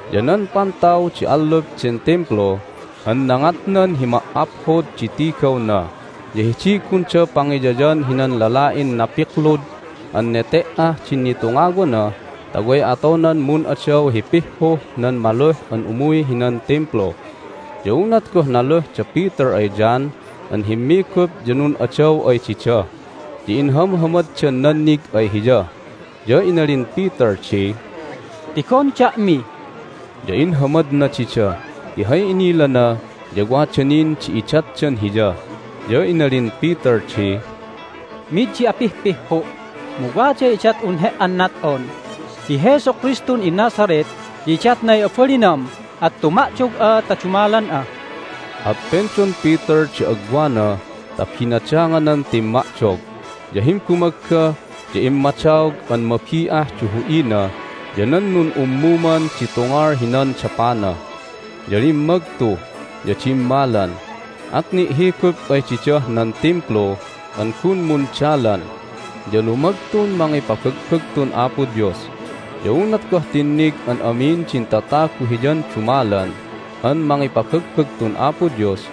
Ya nan pantaw di allup den Timplu an nangadnan hi Ma"aphod di Tigawna ya hidiy gunda pangiyayan hinan lala'in napiklud an nete"ah din nitungawana ta way atonan mun'adaw hi pihhuh nan maluh an umuy hinan Timplu. Ya unat goh naluh da Peter ay John an himmigup ya nun'adaw ay dida. Ya inhamhamaddan nannig ay hiya, ya inalin Peter di, "Tigon da'mi!" Ya inhamadna dida ti hay inilana ya wada nin di idatdan hiya. Ya inalin Peter di, "Mid di apihpihhu', mu waday idat'un he"an nat'on! Hi Jesu Kristun iNazareth ya idatnay abalinam, at tuma'dog'a ta dumalan'a!" At pendon Peter di agwana ta binadanganan timma'dog. Ya himbumagga ya immadaog an mabi'ah di hu'ina ya nan nun'ummuman di tungal hinan dapana. Ya limmagtu, ya dimmalan. At ni'higup ay didah nan Timplu an gun mundalan, ya lumagtun mangipabagbagtun Apo Dios. Ya unat goh tinnig an amin din tatagu hiyan dumalan an mangipabagbagtun Apo Dios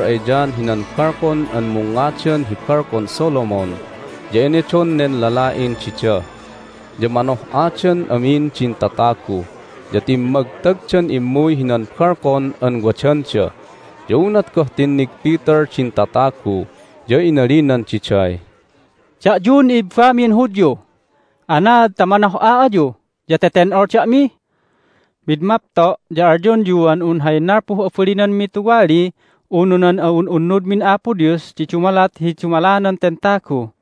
Immuy da Peter ay John hinan balkon an mungngadan hi Balkon Solomon, ya enedon nen lala'in dida. Ya manoh'adan amin din tatagu, ya timmagtagdan immuy hinan balkon an wadanda. Ya unat goh tinnig Peter din tatagu ya inalinan diday, "Da'yun i'ibamin Hudyu, anaad ta manoh'a ayu, ya teten'ol da'mi? Mid mapto' ya alyonyuan un hay nalpuh abalinanmi tuwali unu nan a'un'unnudmin Apo Dios di dumalat hi dumalanan ten tagu!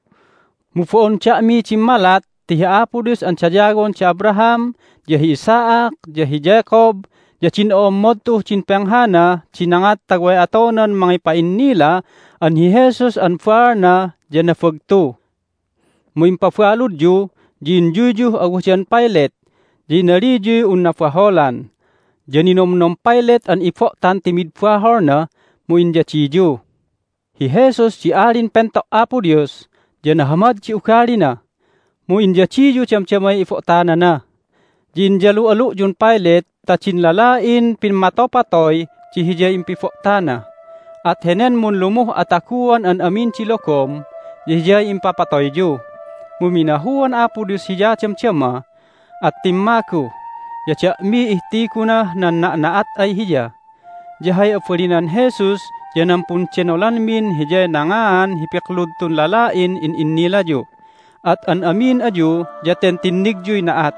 Mu bo'on da'miy dimmalat, ti hi Apo Dios an dayawon da Abraham, ya hi Isaac, ya hi Jacob, ya din o'ommod tu'uh din penghana di nangat ta way atonan mangipa'innila an hi Jesus an baalna ya nabagtu! Mu impabaludyu, ya inyuyyuh awadan Pilate, ya inaliyuy un nabaholan, ya ninomnom Pilate an ibo'tan ti mid baholna, mu inyadiyu. Hi Jesus di Alin Pento' Apo Dios, ya nahamad di ugalina! Mu inyadiyu damdamay ibo'tanana, ya inyalu'alu'yun Pilate ta din lala'in pimmatopatoy di hiyay impibo'tana! At henen munlumuh ataguan an amin di logom ya Hiyay impapatoyyu, mu minahuan Apo Dios Hiya damdama, at timmagu, ya da'miy ihtigunah nan na'na'at ay Hiya. Ya hay abalinan Jesus ya nan pundenolanmin Hiyay nangaan hi piklud tun lala'in in'innilayu. At an amin ayu ya ten tinnigyuy na'at.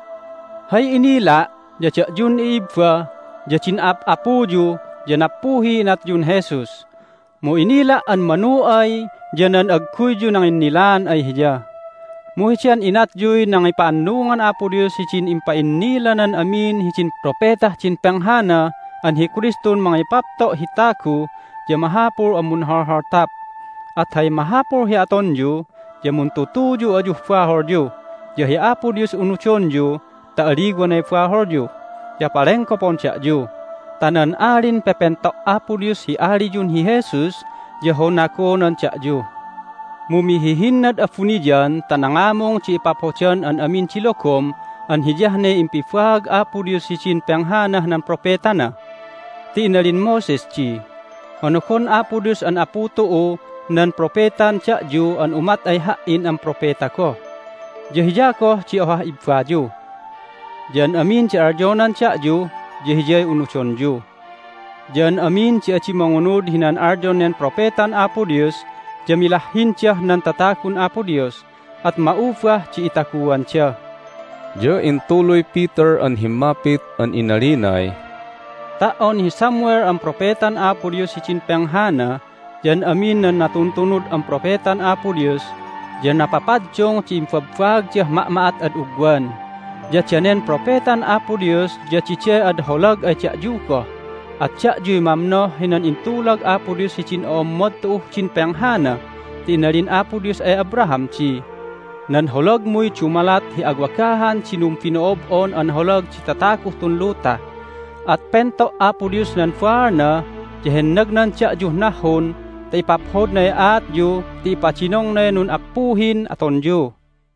Hay inila' ya da'yun i'ibba ya din a'ap'apuyu ya nappuhiy inatyun Jesus, mu inila' an manu ay ya nan agguyyu nanginnilaan ay Hiya. Mu heden inatyuy nangipa'annungan Apo Dios hidin impa'innilanan amin hidin propetah din penghana an hi Kristun mangipapto' hi tagu ya mahapul an munholholtap. At hay mahapul hi atonyu ya muntutuyu ayuh baholyu, ya hi Apo Dios unudonyu ta aliwanay baholyu, ya palenggopon da'yu ta nan Alin Pepento' Apo Dios hi aliyun hi Jesus ya honagonan da'yu. Mu mihihinnad abuniyan ta nangamung di ipaphodan an amin di logom an hiyah ne impibaag Apo Dios hidin penghanah nan propetana. Ti inalin Moses di, Honogon Apo Dios an apu tu'u nan propetan da'yu an umat ay ha"in an propeta goh, ya Hiya goh di ohah ibbayu. Ya an amin di alyonan da'yu ya hiyay unudonyu. Ya an amin di adi mangunud hinan alyon nen propetan Apo Dios ya milahhindah nan tatagun Apo Dios, at ma'ubah di itaguanda." Ya intuluy Peter an himmapit an inalinay, "Ta"on hi Samuel an propetan Apo Dios hidin penghana ya an amin nan natuntunud an propetan Apo Dios ya napapaddung di imbabbaagdah ma'ma'at ad ugwan. Ya danen propetan Apo Dios ya diday ad holag ay da'yu goh, at da'yuy mamnoh hinan intulag Apo Dios hidin o'ommod tu'uh din penghana. Ti inalin Apo Dios ay Abraham di, Nan holagmuy dumalat hi awagahan di numbino'ob'on an holag di tataguh tun luta. At pento' Apo Dios nan baalna, ya hennagnan da'yuh nahhun ta ipaphodnay aatyu ti ipadinongnay nun'appuhin atonyu."